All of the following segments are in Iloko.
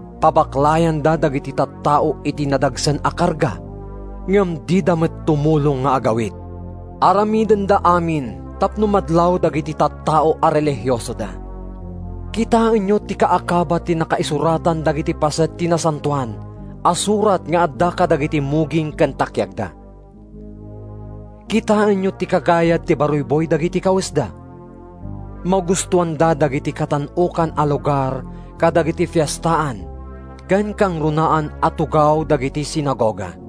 Pabaklayanda dagiti tattao iti nadagsen a karga ngem dida met tumulong nga agawit. Aramidenda amin tapno madlaw dagiti tattao a relihiosoda. Kitaenyo ti kaakaba ti nakaisuratan dagiti paset ti Nasantoan a Surat nga adda kadagiti muging ken takiagda! Kitaenyo ti kagayad ti baruyboy dagiti kawesda! Magustoanda dagiti katan-okan a lugar kadagiti fiestaan ken kangrunaan a tugaw kadagiti sinagoga.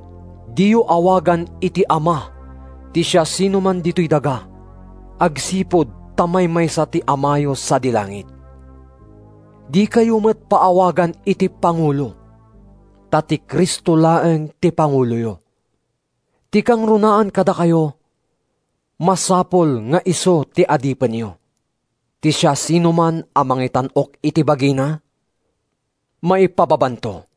Diyo awagan iti ‘Ama’ ti siasinoman ditoy daga agsipud ta maymaysa ti Amayo sadi langit. Dikayo met a paawagan iti ‘Pangulo,’ ta ti Cristo laeng ti panguloyo. Ti kangrunaan kadakayo masapul nga isu ti adipenyo. Ti siasinoman a mangitan-ok iti bagina, maipababanto.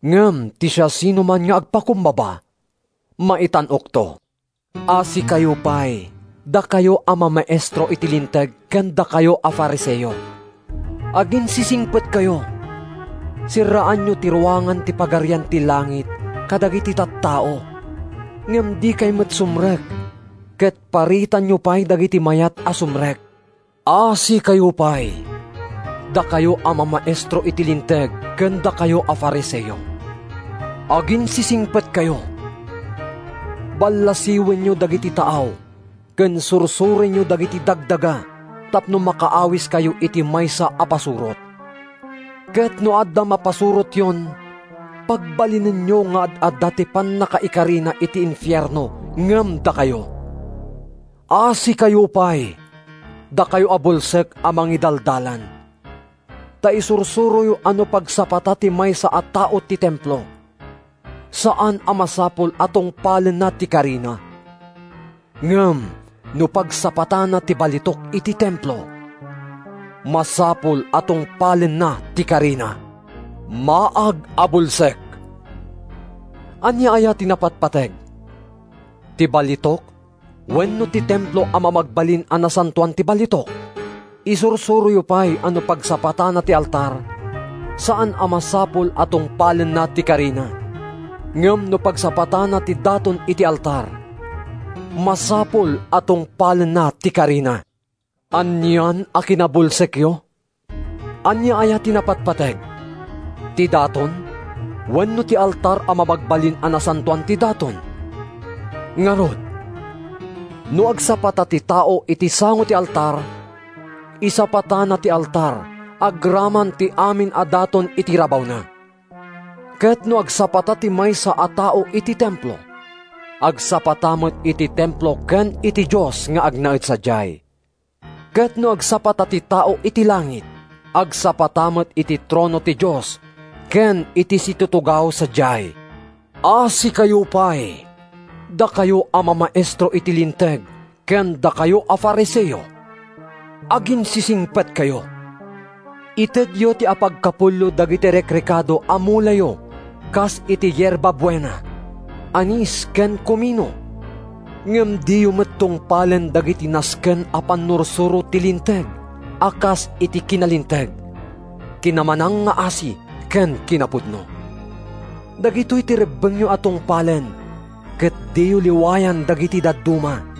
Ngem ti siasinoman nga agpakumbaba, maitan-okto.” “Asikayo pay, dakayo a mamaestro iti Linteg ken dakayo a Fariseo! Aginsisingpetkayo! Serraanyo ti ruangan ti Pagarian ti Langit kadagiti tattao ngem dikay met sumrek ket paritanyo pay dagiti mayat a sumrek. “Asikayo pay, dakayo a mamaestro iti Linteg ken dakayo a Fariseo! Aginsisingpetkayo! Ballasiwenyo dagiti taaw ken sursorenyo dagiti dagdaga tapno makaawiskayo iti maysa a pasurot; ket no adda mapasurotyon pagbalinenyo nga ad-adda ti pannakaikarina iti infierno ngem dakayo. “Asikayo pay, dakayo a bulsek a mangidaldalan! Ta isursuroyo a no pagsapata ti maysa a tao ti Templo, saan a masapul a tungpalenna ti karina; ngem no pagsapatana ti balitok iti Templo, masapul a tungpalenna ti karina. Maag a bulsek! Ania aya ti napatpateg? Ti balitok wenno ti Templo a mamagbalin a nasantoan ti balitok? Isursuroyo pay a no pagsapatana ti altar, saan a masapul a tungpalenna ti karina; ngem no pagsapatana ti daton iti altar, masapul a tungpalenna ti karina. Anian a kinabulsekyo! Ania aya ti napatpateg? Ti daton wenno ti altar a mamagbalin a nasantoan ti daton? Ngarud, no agsapata ti tao iti sango ti altar, isapatana ti altar agraman ti amin a daton iti rabawna; ket no agsapata ti maysa a tao iti Templo, agsapata met iti Templo ken iti Dios nga agnaed sadiay; ket no agsapata ti tao iti langit, agsapata met iti trono ti Dios ken iti situtugaw sadiay. “Asikayo pay, dakayo a mamaestro iti Linteg ken dakayo a Fariseo! Aginsisingpetkayo! Itedyo ti apagkapullo dagiti rekrekado a mulayo kas iti yerbabuena, anis ken kumino, ngem diyo met tungpalen dagiti nasken a pannursuro ti Linteg a kas iti kinalinteg, kinamanangngaasi ken kinapudno. Dagitoy ti rebbengyo a tungpalen ket diyo liwayan dagiti dadduma.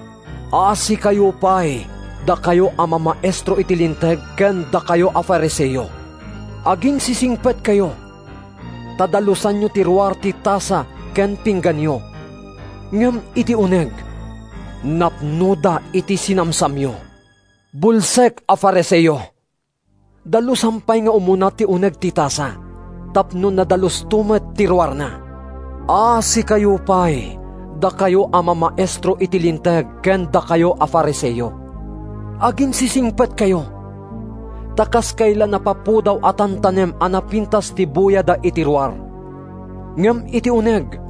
“Asikayo pay, dakayo a mamaestro iti Linteg ken dakayo a Fariseo! Aginsisingpetkayo! Ta dalusanyo ti ruar ti tasa ken pingganyo, ngem iti uneg, napnoda iti sinamsamyo. Bulsek a Fariseo! Dalusam pay nga umuna ti uneg ti tasa, tapno nadalusto met ti ruarna. “Asikayo pay, dakay a mamaestro iti Linteg ken dakay a Fariseo! Aginsisingpetkayo! Ta kaskayla napapudaw a tantanem a napintas ti buyada iti ruar, ngem iti uneg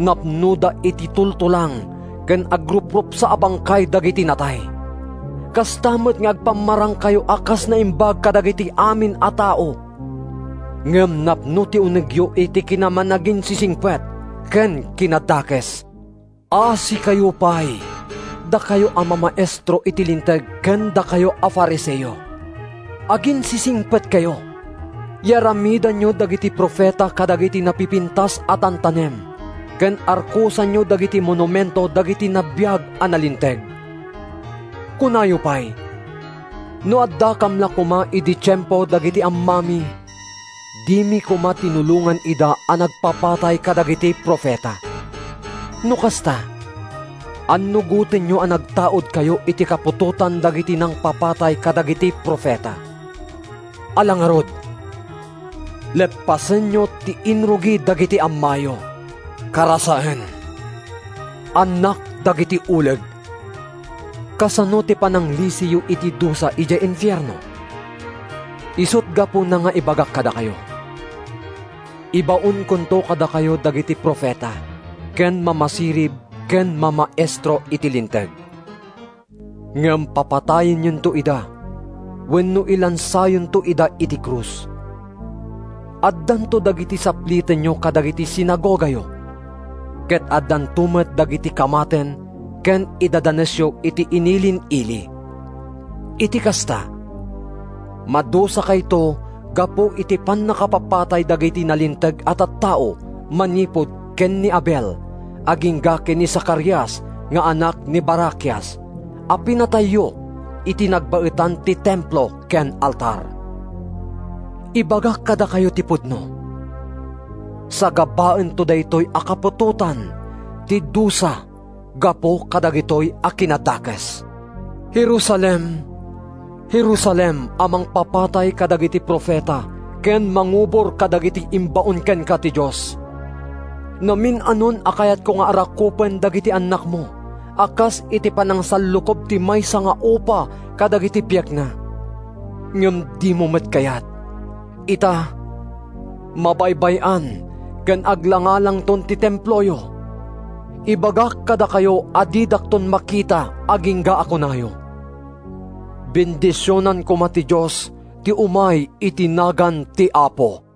napnoda iti tultulang ken agruprupsa a bangkay dagiti natay. Kasta met nga agpamarangkayo a kas naimbag kadagiti amin a tao, ngem napno ti unegyo iti kinamanaginsisingpet ken kinadakes.” “Asikayo pay, dakayo a mamaestro iti Linteg ken dakay a Fariseo! Aginsisingpetkayo! Yaramidanyo dagiti profeta kadagiti napipintas a tantanem ken arkosanyo dagiti monumento dagiti nagbiag a nalinteg. Kunayo pay, ‘No addakam la koma idi tiempo dagiti ammami dimi koma tinulongan ida a nagpapatay kadagiti profeta.’ No kasta, annugotenyo a nagtaudkayo iti kaputotan dagiti nangpapatay kadagiti profeta! Ala ngarud, leppasenyo ti inrugi dagiti ammayo. Karasaen! Annak dagiti uleg! Kasano ti pananglisiyo iti dusa idiay infierno? Isut’ gapuna nga ibagak kadakayo: Ibaonkonto kadakayo dagiti profeta ken mamasirib ken mamaestro iti Linteg. Ngem papatayenyonto ida wenno ilansayonto ida iti krus. Addanto dagiti saplitenyo kadagiti sinagogayo ket addanto met dagiti kamaten ken idadanesyo iti inilin-ili. Iti kasta, madusakayto gapu iti pannakapapatay dagiti nalinteg a tattao manipud ken ni Abel agingga ken ni Zacarias nga anak ni Barakias a pinatayyo iti nagbaetan ti Templo ken ti altar. Ibagak kadakayo ti pudno: Sagabaento daytoy a kaputotan ti dusa gapu kadagitoy a kinadakes!” “Jerusalem, Jerusalem a mangpapatay kadagiti profeta ken mangubor kadagiti imbaon kenka ti Dios! Namin-anon a kayatko nga arakupen dagiti annakmo a kas iti panangsallukob ti maysa nga upa kadagiti piekna, ngem dimo met kayat. Ita, mabaybay-an ken aglangalangton ti Temployo. Ibagak kadakayo a didakton makita agingga a kunayo, ‘Bendisionan koma ti Dios ti umay iti nagan ti Apo!’”